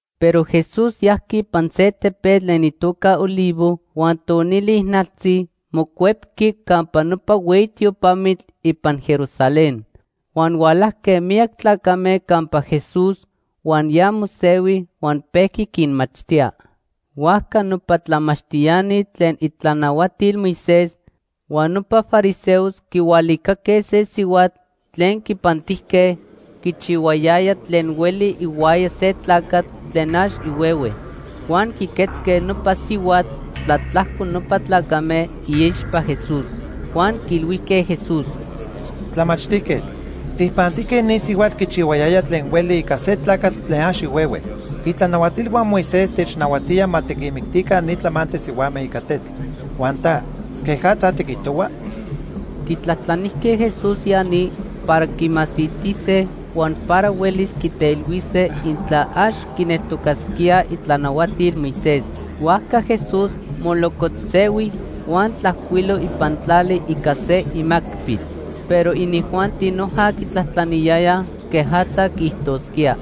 Pero Jesús yajqui ipan se tepetl tlen itoca Olivo, huan tonili ijnaltzi mocuepqui campa nopa hueyi tiopamitl ipan Jerusalén. Huan hualajque miyac tlacame campa Jesús huan ya mosehui huan pejqui quinmachtía. Huajca nopa tlamachtiani tlen itlanahuatil Moisés huan nopa fariseos quihualicaque se sihuatl tlen quipantijque quichihuayaya tlen hueli ihuaya se tlacatl tlen ax ihuehue. Huan quiquetzque nopa sihuatl tlatlajco nopa tlacame iixpa Jesús. Huan quiilhuijque Jesús: ―Tlamachtijquetl, tijpantijque ni sihuatl quichihuayaya tlen hueli ica se tlacatl tlen ax ihuehue. Itlanahuatilhua Moisés technahuatía ma tiquinmictica ni tlamantli sihuame ica tetl. Huan ta, ¿quejatza tiquijtohua? Quitlajtlanijque Jesús ya ni para quimasiltise huan para huelis quiteilhuise intla ax quineltocasquía itlanahuatil Moisés. Huajca Jesús molocotzsehui huan tlajcuilo ipan tlali ica se imacpil. Pero inijuanti noja quitlajtlaniyayaj quejatza quiijtosquía.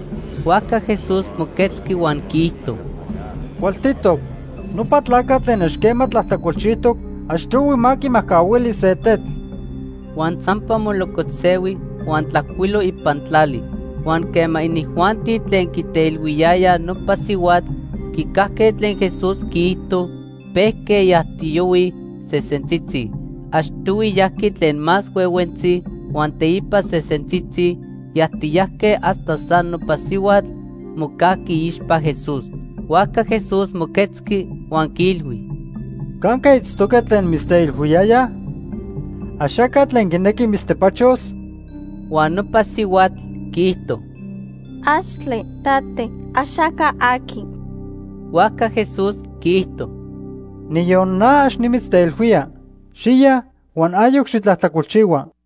Huajca Jesús moquetzqui huan quiijto: ―Cualtitoc. Nopa tlacatl tlen ax quema tlajtlacolchijtoc achtohui ma quimajcahuili se tetl. Huan sampa molocotzsehui huan tlajcuilo ipan tlali. Huan quema inijuanti tlen quiteilhuiyayaj nopa sihuatl quicajque tlen Jesús quiijto, pejque yajtiyohuij sesentzitzi. Achtohui yajqui tlen más huehuentzi huan teipa sesentzitzi yajtiyajque hasta san nopa sihuatl mocajqui iixpa Jesús. Huajca Jesús moquetzqui huan quiilhui: ―¿Canque itztoque tlen mitzteilhuiyayaj? ¿Axaca tlen quinequi mitztepachos? Huan nopa sihuatl quiijto: ―Axtle, tate, axaca aqui. Huajca Jesús quiijto: ―Niyon na ax nimitzteilhuía. Xiya huan ayoc xitlajtlacolchihua.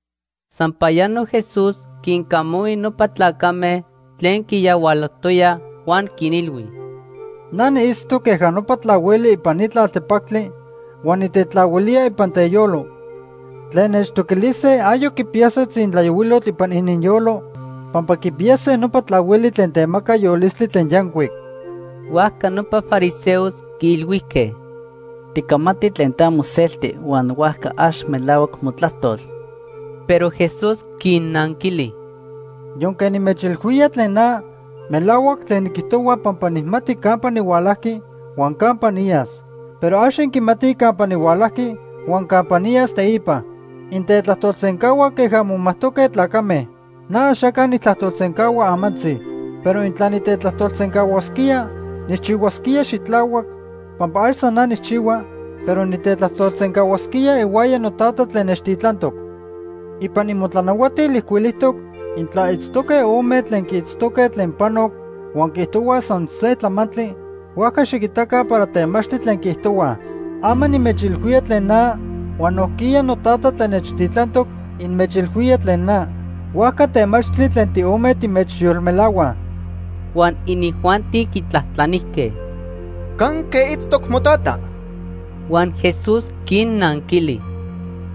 Sampayano Jesús quincamahui nopa tlacame tlen quiyahualojtoyaj huan quinilhui: ―Na niitztoc queja nopa tlahuili ipan ni tlaltepactli huan nitetlahuilía ipan teyolo. Tlen nechtoquilise ayoc quipiyase tzintlayohuilotl ipan ininyolo pampa quipiyase nopa tlahuili tlen temaca yolistli tlen yancuic. Huajca nopa fariseos quiilhuijque: ―Ticamati tlen ta moselti huan huajca ax melahuac motlajtol. Pero Jesús quinnanquili: ―Yonque nimechilhuía tlen na, melahuac tlen niquijtohua pampa nijmati campa nihualajqui huan campa niyas. Pero ax inquimatij campa nihualajqui huan campa niyas teipa. Intetlajtolsencahuaj queja momajtoque tlacame. Na axaca nijtlajtolsencahua amantzi. Pero intla nitetlajtolsencahuasquía, nijchihuasquía xitlahuac pampa ax san na nijchihua, pero nitetlajtolsencahuasquía ihuaya noTata tlen nechtitlantoc. Ipan imotlanahuatil ijcuilijtoc intla itztoque ome tlen quiitztoque tlen panoc huan quiijtohuaj san se tlamantli, huajca xiquitaca para temachtli tlen quiijtohuaj. Ama nimechilhuía tlen na huan nojquiya noTata tlen nechtitlantoc inmechilhuía tlen na, huajca temachtli tlen tiome timechyolmelahuaj. Huan inijuanti quitlajtlanijque: ―¿Canque itztoc motata? Huan Jesús quinnanquili: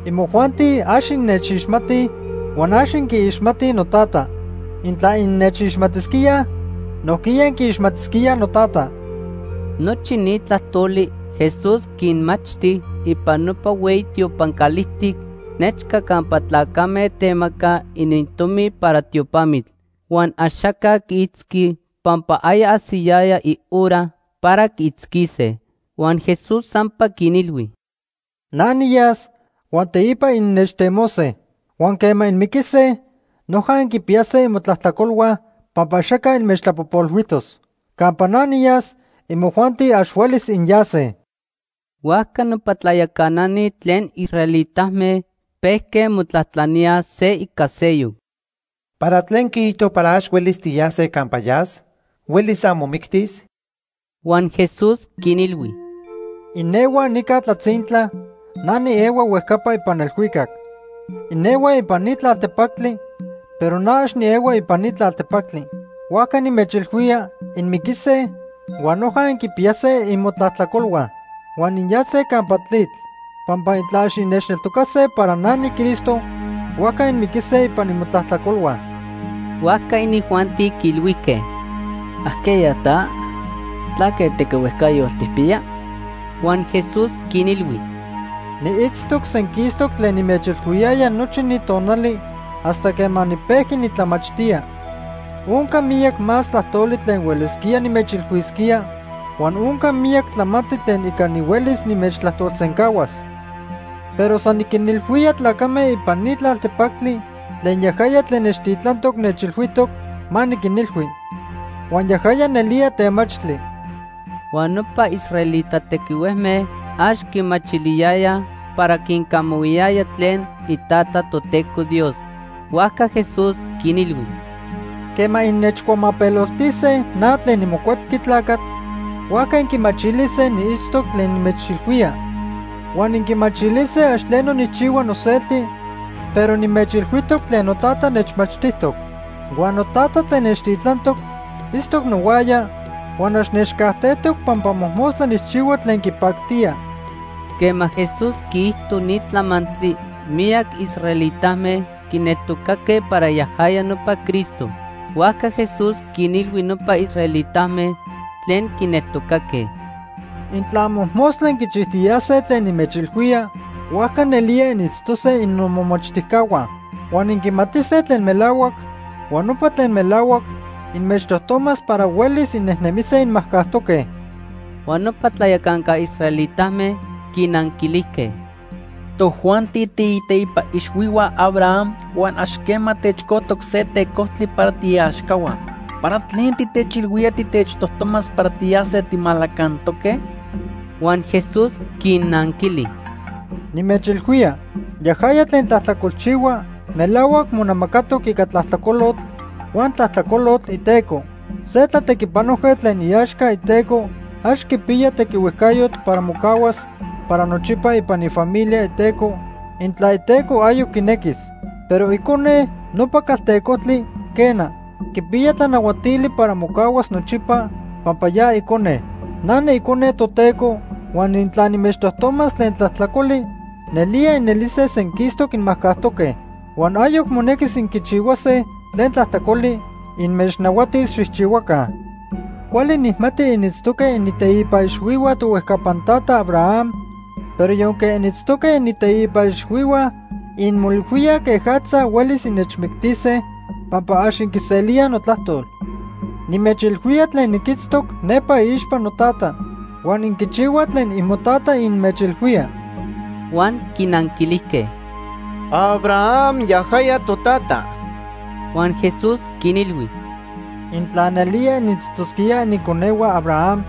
―Imojuanti ax innechixmatij huan ax inquiixmatij noTata. Intla innechixmatisquíaj, nojquiya inquiixmatisquíaj noTata. Nochi ni tlajtoli Jesús quinmachti ipan nopa hueyi tiopan calijtic nechca campa tlacame temacaj inintomi para tiopamitl. Huan axaca quiitzqui pampa aya ajsiyaya ihora para quiitzquise. Huan Jesús sampa quinilhui: ―Na niyas huan teipa innechtemose. Huan quema inmiquise, noja inquipiyase imotlajtlacolhua pampa axaca inmechtlapojpolhuijtos. Campa na niyas, imojuanti ax huelis inyase. Huajca nopa tlayacanani tlen israelitame pejque motlajtlaníaj se ica seyoc: ―¿Para tlen quiijto para ax huelis tiyase campa yas? ¿Huelis san momictis? Huan Jesús quinilhui: ―Inehuaj nica tlatzintla, na niehua huejcapa ipan elhuicac. Inehuaj ipan ni tlaltepactli, pero na ax niehua ipan ni tlaltepactli. Huajca nimechilhuía inmiquise huan noja inquipiyase imotlajtlacolhua huan inyase campa tlitl. Pampa intla ax innechneltocase para na niCristo, huajca inmiquise ipan imotlajtlacolhua. Huajca inijuanti quiilhuijque: ―¿Ajqueya ta? ¿Tlaque tequihuejcayotl tijpiya? Huan Jesús quinilhui: ―Niitztoc senquistoc tlen nimechilhuiyaya nochi ni tonali hasta quema nipejqui nitlamachtía. Onca miyac más tlajtoli tlen huelisquía nimechilhuisquía huan onca miyac tlamantli tlen ica nihuelis nimechtlajtolsencahuas. Pero san niquinilhuía tlacame ipan ni tlaltepactli tlen yajaya tlen nechtitlantoc nechilhuijtoc ma niquinilhui. Huan yajaya nelía temachtli. Huan nopa israelita tequihuejme ax quimachiliyayaj para quincamahuiyaya tlen iTata, Toteco Dios. Huajca Jesús quinilhui: ―Quema innechcuamapeloltise na tlen niMocuepqui Tlacatl, huajca inquimachilise niitztoc tlen nimechilhuía. Huan inquimachilise ax tleno nijchihua noselti, pero nimechilhuijtoc tlen noTata nechmachtijtoc. Huan noTata tlen nechtitlantoc itztoc nohuaya huan ax nechcajtejtoc pampa mojmostla nijchihua tlen quipactía. Quema Jesús quiijto ni tlamantli, miyac israelitame quineltocaque para yajaya nopa Cristo. Huajca Jesús quinilhui nopa israelitame tlen quineltocaque: ―Intla mojmostla inquichijtiyase tlen nimechilhuía, huajca nelía initztose innomomachtijcahua. Huan inquimatise tlen melahuac, huan nopa tlen melahuac inmechtojtomas para huelis innemise inmajcajtoque. Huan nopa tlayacanca israelitame quinanquilijque: ―Tojuanti tiiteipa ixhuihua Abraham huan ax quema techcojtoc se tecojtli para tiiaxcahua. ¿Para tlen titechilhuía titechtojtomas para tiyase timalacantoque? Huan Jesús quinnanquili: ―Nimechilhuía, yajaya tlen tlajtlacolchihua melahuac monamacatoc ica tlajtlacolotl huan tlajtlacolotl iteco. Se tlatequipanojquetl tlen iaxca iteco ax quipiya tequihuejcayotl para mocahuas para nochipa ipan ifamilia iteco, intla iteco ayoc quinequis; pero icone nopa caltecojtli, quena, quipiya tlanahuatili para mocahuas nochipa pampa ya icone. Na niIcone Toteco huan intla nimechtojtomas tlen tlajtlacoli, nelía inelise senquistoc inmajcajtoque. Huan ayoc monequis inquichihuase tlen tlajtlacoli inmechnahuatis xijchihuaca. Cuali nijmati initztoque initeipa ixhuihua tohuejcapan tata Abraham, pero yonque initztoque initeipa ixhuihua, inmoilhuíaj quejatza huelis innechmictise pampa ax inquiselíaj notlajtol. Nimechilhuía tlen niquitztoc nepa iixpa noTata. Huan inquichihuaj tlen imotata inmechilhuía. Huan quinanquilijque: ―Abraham yajaya totata. Huan Jesús quinilhui: ―Intla nelía initztosquíaj iniconehua Abraham,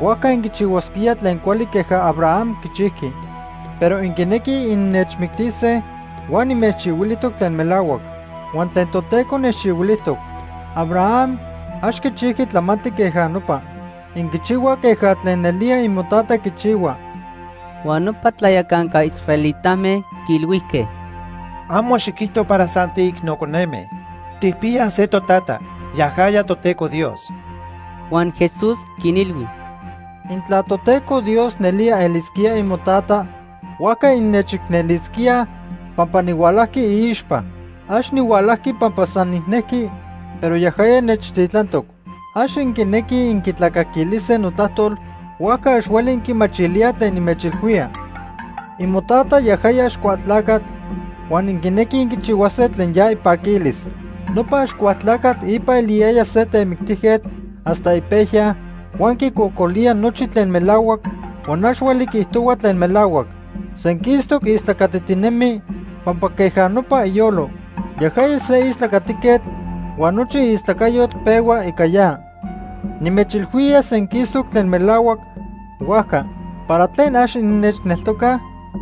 huajca inquichihuasquíaj tlen cuali queja Abraham quichijqui. Pero inquinequij innechmictise, huan nimechilhuijtoc tlen melahuac. Huan tlen Toteco nechilhuijtoc. Abraham ax quichijqui tlamantli queja nopa. Inquichihuaj queja tlen nelía imotata quichihua. Huan nopa tlayacanca israelitame quiilhuijque: ―Amo xiquijto para san tiicno coneme. Tijpiyaj se totata, yajaya Toteco Dios. Huan Jesús quinilhui: ―Intla Toteco Dios nelía elisquía imotata, huajca innechicnelisquíaj pampa nihualajqui iixpa. Ax nihualajqui pampa san nijnejqui, pero yajaya nechtitlantoc. Ax inquinequij inquitlacaquilise notlajtol, huajca ax hueli inquimachilíaj tlen nimechilhuía. Imotata yajaya Axcualtlacatl huan inquinequij inquichihuase tlen ya ipaquilis. Nopa Axcualtlacatl ipa eliyaya se temictijquetl hasta ipejya huan quicocolía nochi tlen melahuac huan ax hueli quiijtohua tlen melahuac. Senquistoc istlacatitinemi pampa queja nopa iyolo. Yajaya se istlacatiquetl huan nochi istlacayotl pehua ica ya. Nimechilhuía senquistoc tlen melahuac, huajca ¿para tlen ax innechneltocaj?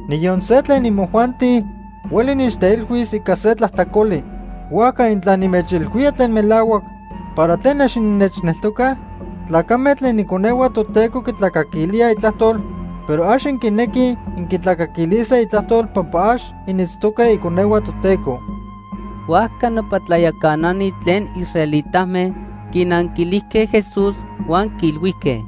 Niyon se tlen imojuanti hueli nechteilhuis ica se tlajtlacoli. Huajca intla nimechilhuía tlen melahuac, ¿para tlen ax innechneltocaj? Tlacame tlen iconehua Toteco quitlacaquilíaj itlajtol, pero ax inquinequij inquitlacaquilise itlajtol pampa ax initztoque iconehua Toteco. Huajca nopa tlayacanani tlen israelitame quinanquilijque Jesús huan quiilhuijque: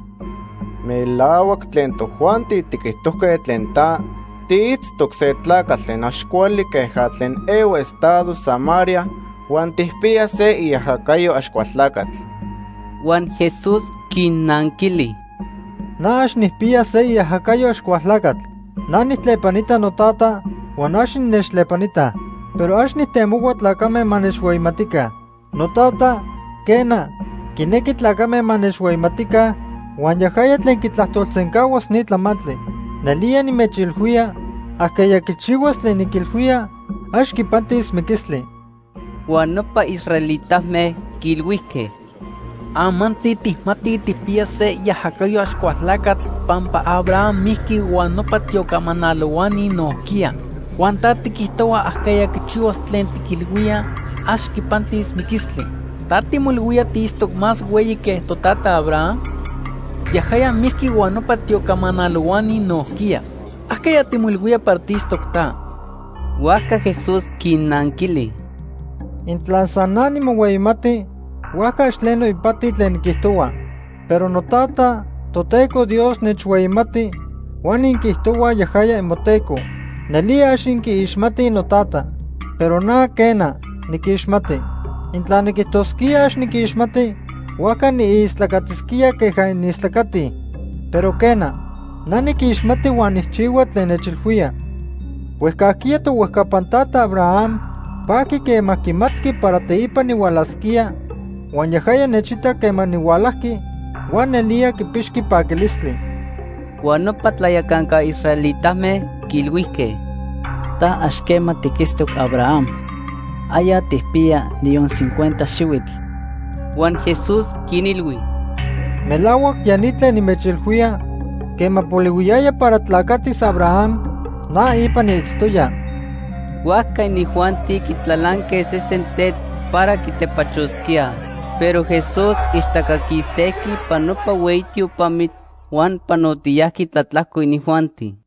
―Melahuac tlen tojuanti tiquijtojque tlen ta. Tiitztoc se tlacatl tlen ax cuali queja tlen ehua estado Samaria huan tijpiya se iajacayo Axcualtlacatl. Huan Jesús quinnanquili: ―Na ax nijpiya se iajacayo Axcualtlacatl. Na nijtlepanita noTata huan ax innechtlepanitaj. Pero ax nijtemohua tlacame ma nechhueyimatica. NoTata, quena, quinequi tlacame ma nechhueyimatica huan yajaya tlen quitlajtolsencahuas ni tlamantli. Nelía nimechilhuía, ajqueya quichihuas tlen niquilhuía, ax quipantis miquistli. Huan nopa israelitame quiilhuijque: ―Amantzi tijmatij tijpiya se iajacayo Axcualtlacatl pampa Abraham mijqui huan nopa tiocamanalohuani nojquiya. Huan ta tiquijtohua ajqueya quichihuas tlen tiquilhuía, ax quipantis miquistli. Ta timoilhuía tiitztoc más hueyi que totata Abraham. Yajaya mijqui huan nopa tiocamanalohuani nojquiya. ¿Ajqueya timoilhuía para tiitztoc ta? Huajca Jesús quinnanquili: ―Intla san na nimohueyimati, huajca ax tleno ipati tlen niquijtohua. Pero noTata, Toteco Dios, nechhueyimati huan inquiijtohuaj yajaya imoTeco. Nelía ax inquiixmatij noTata. Pero na, quena, niquixmati. Intla niquijtosquía ax niquixmati, huajca niistlacatisquía queja inistlacatij. Pero, quena, na niquixmati huan nijchihua tlen nechilhuía. Huejcajquiya tohuejcapan tata Abraham pajqui quema quimatqui para teipa nihualasquía, huan yajaya nechitac quema nihualajqui huan nelía quipixqui paquilistli. Huan nopa tlayacanca israelitame quiilhuijque: ―Ta ax quema tiquitztoc Abraham. Aya tijpiya niyon cincuenta xihuitl. Huan Jesús quinilhui: ―Melahuac ya ni tlen nimechilhuía, quema polihuiyaya para tlacatis Abraham, na ipa niitztoya. Huajca inijuanti quitlalanque sesen tetl para quitepachosquíaj, pero Jesús ixtaca quistejqui ipan nopa hueyi tiopamitl huan panotiyajqui tlatlajco inijuanti.